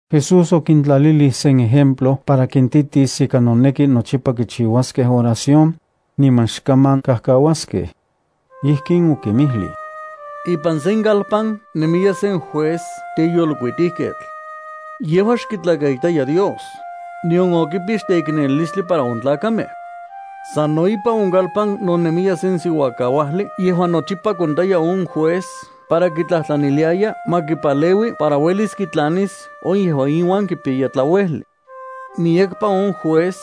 Jesús okintlalilij sen ejemplo para kintitis ika noneki nochipa kichiuaskej oración, niman xkaman kajkauaskej. Ijkin okinmijlij: —Ipan sen kalpan nemiya sen juez teyolkuitijketl. Yejua xkitlakaitaya Dios, nion okipix teiknelilistli para on tlakamej. Sano ipan on kalpan no nemiya sen siuakauajli yejuan nochipa kontaya on juez para kitlajtlaniliaya ma kipaleui para uelis kitlanis on yejuan iuan kipiyaya tlauejli. Miyekpa on juez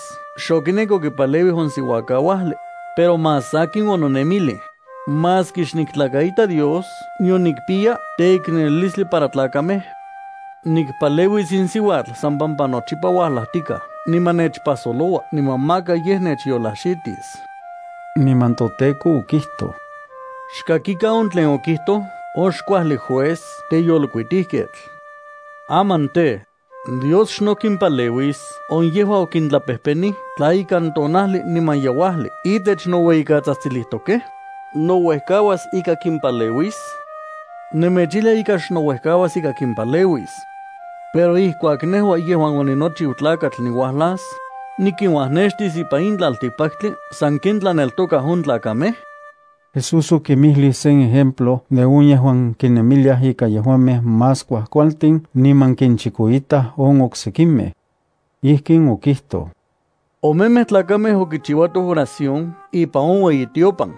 xokinek okipaleuij on siuakauajli, pero más sakin ononemilij: “Maski xniktlakaita Dios nion nikpiya teiknelilistli para tlakamej, nikpaleuis in siuatl san pampa nochipa uajlajtika niman nechpajsoloua niman maka yej nechyolajxitis.” Niman toTEKO okijtoj: —Xkakikan on tlen okijtoj on xkuajli juez teyolkuitijketl. Aman tej, ¿Dios xno kimpaleuis on yejuan okintlapejpenij tla ikan tonajli niman yeuajli itech noueyikatsajtsilijtokej? ¿Nouejkauas ika kimpaleuis? Nemechijlia ika xnouejkauas ika kimpaleuis. Pero ijkuak nejua yejuan oninochiu Tlakatl niuajlas, ¿Nikinuajnextis ipan in tlaltikpaktli sanken tlaneltokaj on tlakamej? Jesús okinmijlij sen ejemplo de on yejuan kinemiliaj ika yejuamej más kuajkualtin niman kinchikoitaj on oksekimej. Ijkin okijtoj: —Omemej tlakamej okichiuatoj oración ipan on ueyitiopan.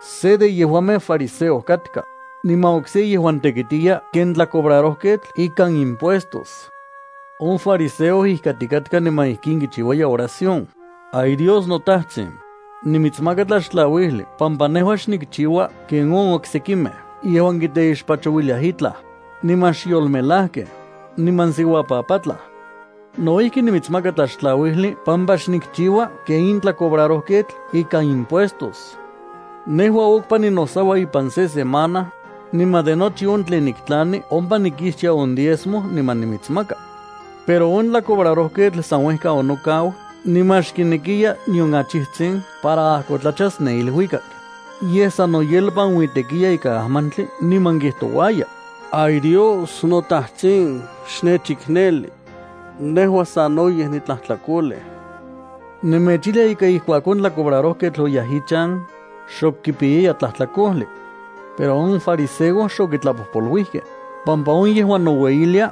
Se de yejuamej fariseo katka, niman okse yejuan tekitiya ken tlacobrarojketl ikan impuestos. On fariseo ijkatikatka niman ijkin kichiuaya ioración: “Ay Dios noTajtsin, nimitsmaka tlaxtlauijli pampa nejua xnikchiua ken on oksekimej yejuan kiteixpachouiliaj itlaj, niman xyolmelajkej, niman siuapapatlaj. No ijki nimitsmaka tlaxtlauijli pampa xnikchiua ken in tlacobrarojketl ikan impuestos. Nejua okpa ninosaua ipan se semana, niman de nochi on tlen niktlani ompa nikixtia on diezmo niman nimitsmaka.” Pero on tlacobrarojketl san uejka onokau niman xkinekiya nion achijtsin para ajkotlachas ne iluikak, yej san noyelpanuitekiya ikan ajmantli niman kijtouaya: “¡Ay Dios, noTajtsin, xnechikneli! Nejua sanoyej nitlajtlakolej.” Nemechijlia ika ijkuak on tlacobrarojketl oyaj ichan, xok kipiyaya tlajtlakojli. Pero on fariseo xokitlapojpoluijkej, pampa on yejuan noueyilia,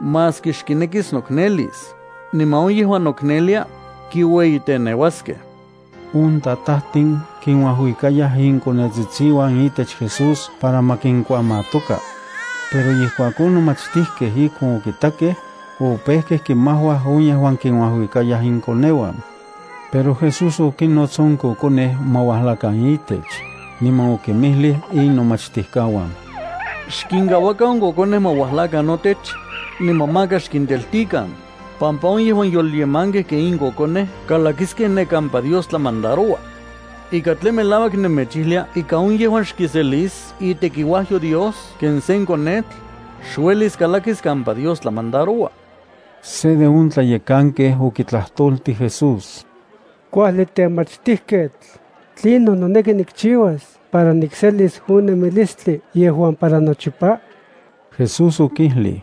maski xkinekis noknelis, niman on yejuan noknelia, kiueyiteneuaskej. On tajtatin kinuajuikayaj inkonetsitsiuan itech Jesús para ma kinkuamatoka. Pero ijkuak on nomachtijkej ijkon okitakej, opejkej kimajuaj on yejuan kinuajuikayaj inkokoneuan. Pero Jesús okinnots on kokonej ma uajlakan itech, niman okinmijlij inomachtijkauan: —Xkinkauakan on kokonej ma uajlakan notech, niman maka xkinteltikan, pampa on yejuan yolyemankej ken in kokonej kalakiskej ne kampa Dios tlamandaroua. Ika tlen melauak nemechijlia ika on yejuan xkiselis itekiuajyo Dios ken sen konetl, xuelis kalakis kampa Dios tlamandaroua. Se de on tlayekankej okitlajtoltij Jesús: —Kuajli temachtijketl, ¿tlinon noneki nikchiuas para nikselis on nemilistli yejuan para nochipa? Jesús okijlij: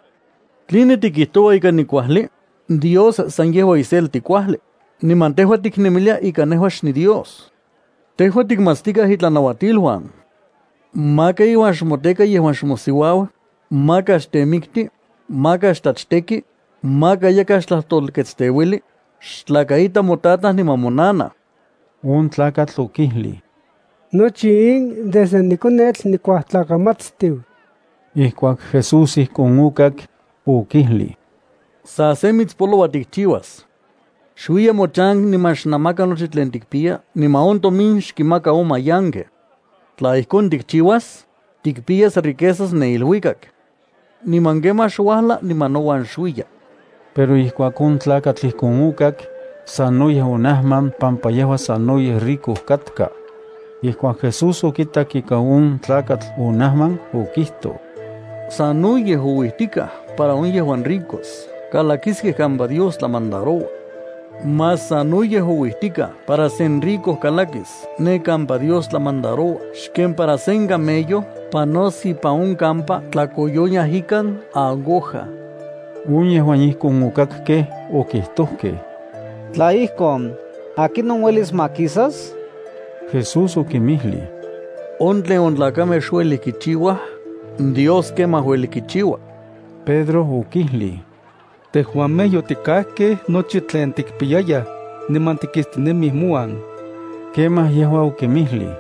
—¿Tline tikijtoua ika nikuajli? Dios san yejua iselti kuajli, niman tejua tiknemilia ika nejua xniDios. Tejua tikmatstikaj itlanauatiluan: “Maka iuan xmoteka yejuan xmosiuau, maka xtemikti, maka xtlachteki, maka yakaj xtlajtolketsteuili, xtlakaita motataj niman monanaj.” On tlakatl okijlij: —Nochi in desde nikonetl nikuajtlakamatstiu. Ijkuak Jesús ijkon okak, okijlij: —Sa se mitspoloua tikchiuas. Xuiya mochan niman xnamaka nochi tlen tikpiya niman on tomin xkinmaka on mayankej. Tla ijkon tikchiuas, tikpiyas riquezas ne iluikak. Niman kemaj xuajla niman nouan xuiya. Pero ijkuak on tlakatl ijkon okak, sanoyej onajman pampa yejua sanoyej rico katka. Ijkuak Jesús okitak ika on tlakatl onajman, okijtoj: —¡Sanoyej ouijtikaj para on yejuan ricos kalakiskej kampa Dios tlamandaroua! Más sanoyej ouijtikaj para sen rico kalakis ne kampa Dios tlamandaroua xken para sen camello panos ipan on kampa tlakoyoniaj ikan aguja. On yejuan ijkon okakkej okijtojkej: —Tla ijkon, ¿akinon uelis makisas? Jesús okinmijlij: —On tlen on tlakamej xuelij kichiuaj, Dios kemaj ueli kichiua. Pedro okijlij: —Tejuamej yotikajkej nochi tlen tikpiyayaj, niman tikistinemij mouan. Kemaj yejua okinmijlij: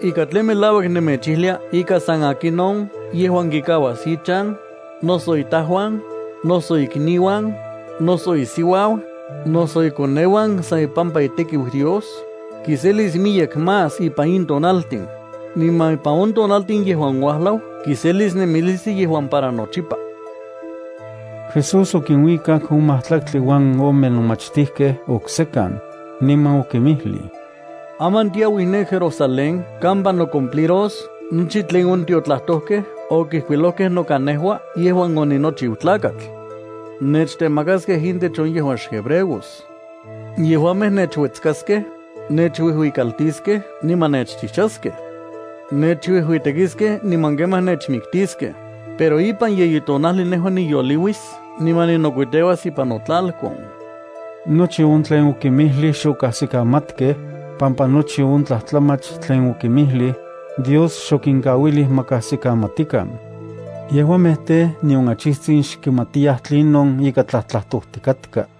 —Ika tlen melauak nemechijlia ika san akinon yejuan kikauas ichan, noso itajuan, noso ikniuan, noso isiuau, noso ikoneuan san ipampa itekiu Dios, kiselis miyek más ipan in tonaltin, niman ipan on tonaltin yejuan uajlau kiselis nemilistli yejuan para nochipa. Jesús okinuikak on majtlaktli uan ome nomachtijkej oksekan, niman okinmijlij: —Aman tiauij ne Jerusalén kampa nocumpliros nochi tlen on tiotlajtojkej okijkuilojkej noka nejua yejuan oninochiu Tlakatl. Nechtemakaskej intech on yejuan xhebreos. Yejuamej nechuetskaskej, nechuijuikaltiskej niman nechchijchaskej. Nechuijuitekiskej niman kemaj nechmiktiskej, pero ipan yeyi tonajli nejua niyoliuis niman ninokuiteuas ipan notlalkon. Nochi on tlen okinmijlij xokajsikamatkej, pampa nochi on tlajtlamach tlen okinmijlij, Dios xokinkauilij ma kajsikamatikan. Yejuamej tej, nion achijtsin xkimatiyaj tlinon ika tlajtlajtojtikatka.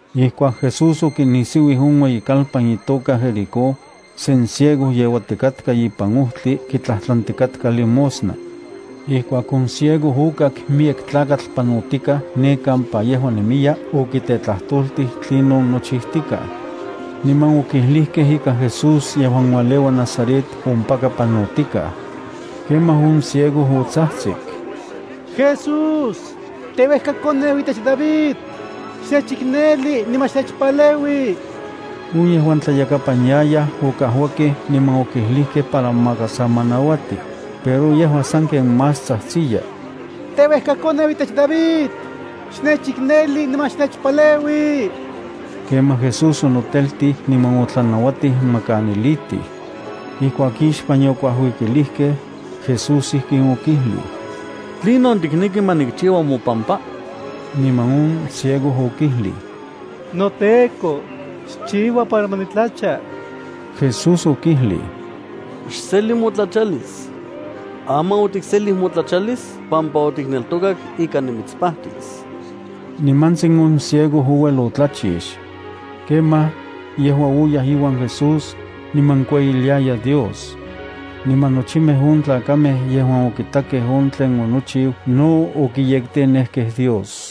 Ijkuak Jesús okinisiuij on ueyikalpan itoka Jericó, sen ciego yeuatikatka ipan ojtli kitlajtlantikatka limosna. Ijkuak on ciego okak miyek tlakatl panotikaj ne kampa yejua nemiya, okitetlajtoltij tlinon nochijtikaj. Niman okijlijkej ika Jesús yejuan ualeua Nazaret ompaka panotikaj. Kemaj on ciego otsajtsik: —¡Jesús, teuejkakoneu itech David, xnechikneli niman xnechpaleui! On yejuan tlayakapan yayaj okajuakej niman okijlijkej para maka sa ma nauati, pero yejua sanken más tsajtsiya: —¡Teuejkakoneu itech David, xnechikneli niman xnechpaleui! Kemaj Jesús onoteltij niman otlanauatij ma kanilitij. Ijkuak ixpan yokuajuikilijkej, Jesús ijkin okijlij: —¿Tlinon tikneki ma nikchiua mopampa? Niman on ciego okijlij: —NoTEKO, xchiua para ma nitlacha. Jesús okijlij: —¡Xseli motlachalis! Aman otikselij motlachalis pampa otikneltokak ika nimitspajtis. Nimantsin on ciego ouel otlachix. Kemaj yejua oyaj iuan Jesús, niman kueyiliaya Dios. Niman nochimej on tlakamej yejuan okitakej on tlen onochiu no okiyektenejkej Dios.